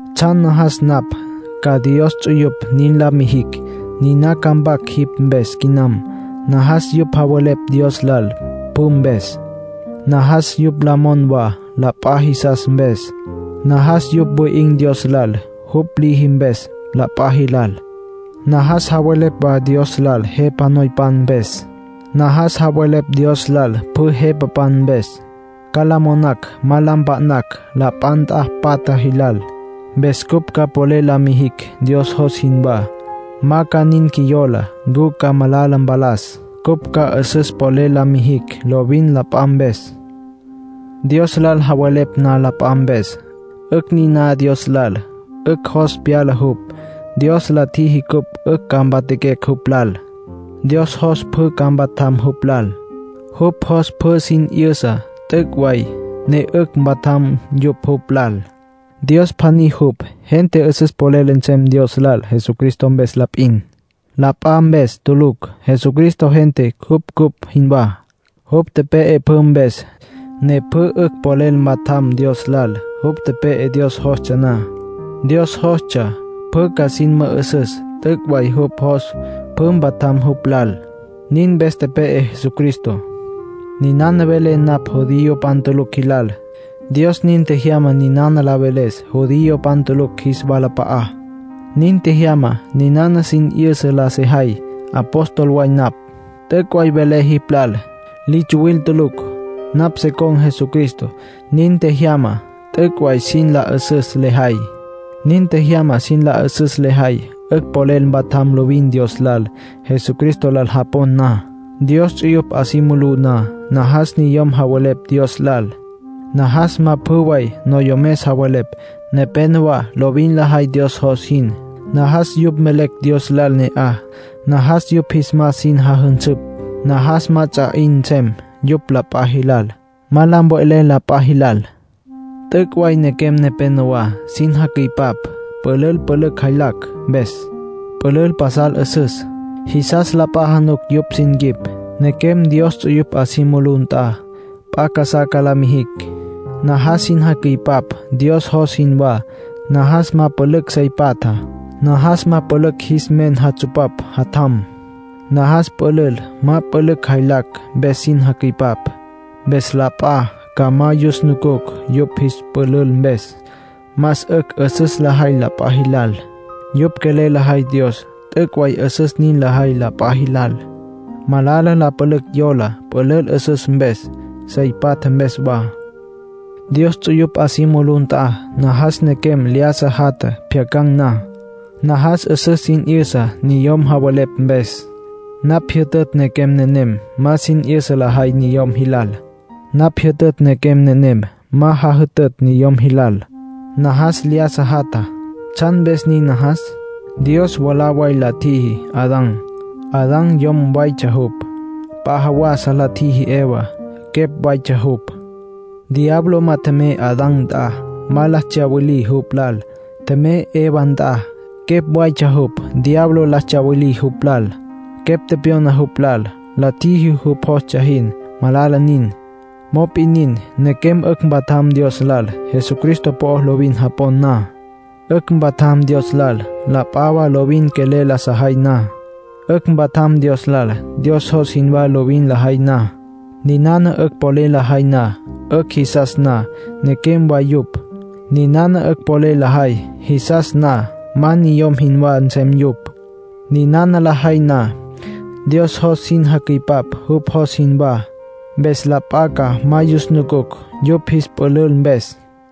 Tsjan najas napj ca Dios ts'uyupj nin la mijicj, niná ca mpac jipj mpes quinam. Najas yupj javelepj Dios lal pjü mpes. Najas yupj la mon wa la p'a jisas mpes. Najas yupj wi'in̈ Dios lal jupj liji mpes la p'a jilal. Najas javelepj wa Dios lal jepa noypan mpes. Najas javelepj Dios lal pjü jepapan mpes. Ca la monacj ma la mpa'nacj la p'a nt'a patja jilal. Mpes cupj ca polel la mijicj Dios jos jinwá; ma ca nin qjuiyola ncu ca malala mpalas. Cupj ca 'üsüs polel la mijicj lovin la p'a mpes. Dios lal javelepj na la p'a mpes, 'ücj niná Dios lal. 'Ücj jos pyala jupj. Dios la tjiji cupj 'ücj ca mpatjaquecj jupj lal. Dios jos pjü ca mpatjam jupj lal. Jupj jos pjü sin 'yüsa t'üc' way, ne 'ücj mpatjam yupj jupj lal. Dios pjaní jupj. Gente 'üsüs polel nsem Dios lal Jesucristo mpes la p'in. La p'a mpes tulucj. Jesucristo gente jupj cupj jinwá. Jupj tepe'e pjü mpes, ne pjü 'ücj polel mpatjam Dios lal. Jupj tepe'e Dios jostsja na. Dios jostsja pjü ca sin mü'üsüs t'üc' way jupj jos pjü mpatjam jupj lal; nin mpes tepe'e Jesucristo. Ninana velé napj judiopan tulucj jilal. Dios nin tjejyama ninana la veles judiopan tulucj jis walap'a'á. Nin tjejyama ninana sin 'yüsa la sejay. Apóstol way napj. T'üc' way velé jipj lal. Li tsuwil tulucj. Napj se con̈ Jesucristo. Nin tjejyama t'üc' way sin la 'üsüs lejay. Nin tjejyama sin la 'üsüs lejay 'ücj polel mpatjam lovin Dios lal, Jesucristo lal japon na. Dios ts'uyupj 'a si mulú na, najas niyom javelepj Dios lal. Najas ma pjü way noyomes javelepj. Nepénowa lovin lajay Dios jos jin; najas yupj mvelecj Dios lal ne'aj. Najas yupj jis mas sin jajünsüpj. Najas ma ts'a 'in nsem yupj la p'a jilal, ma la mve'lecj la p'a jilal. T'üc' way nequem nepénowa sin jacüipap pülül pülücj jaylactsja mpes, pülül pasal 'üsüs. Jisas la p'a januc yupj sin quip. Nequem Dios ts'uyupj 'a si mulú nt'a, p'a casá ca la mijicj. Najas sin jacüipap Dios jos jinwá. Najas ma pülücj sey patja. Najas ma pülücj jis men jatsupapj jatjam. Najas pülül ma pülücj jaylacj mpes sin jacüipap. Mpes la p'a ca ma yus nucucj yupj jis pülül mpes. Más 'ücj 'üsüs lajay la p'a jilal. Yupj quelel lajay Dios, t'üc' way 'üsüs nin lajay la p'a jilal. Malala la pülücj yola pülül 'üsüs mpes, sey patja mpes wa. Dios ts'uyupj 'a si mulú nt'a, najas nequem lyájasa jatja pjyacan̈ na. Najas 'üsüs sin 'yüsa niyom javelepj mpes. Napj jyütütj nequem nenem ma sin 'yüsa lajay niyom jilal. Napj jyütütj nequem nenem ma jajütütj niyom jilal. Najas lyájasa jatja. ¿Tsjan mpes nin najas? Dios mwalá way la tjiji Adán, Adán yom waytsja jupj. P'a jawasa la tjiji Evá, quepj waytsja jupj. Diablo ma tjemey Adán nt'a, ma la tsyawilí jupj lal. Tjemey Eva nt'a, quepj waytsja jupj. Diablo la tsyawilí jupj lal. Quepj tepyona jupj lal. La tjiji jupj jostsja jin. Malala nin. Mop'in nin, nequem 'ücj mpatjam Dios lal, Jesucristo po'o lovin japon na. 'Ücj mpatjam Dios lal, la p'a wa lovin quelel la sajay na. 'Ücj mpatjam Dios lal, Dios jos jinwá lovin lajay na. Ninana 'ücj polel lajay, 'ücj jisas na nequem way yupj. Ninana 'ücj polel lajay, jisas na ma niyom jinwá nsem yupj. Ninana lajay na, Dios jos sin jacüipap jupj jos jinwá. Mpes la p'a ca ma yus nucucj yupj jis pülül mpes.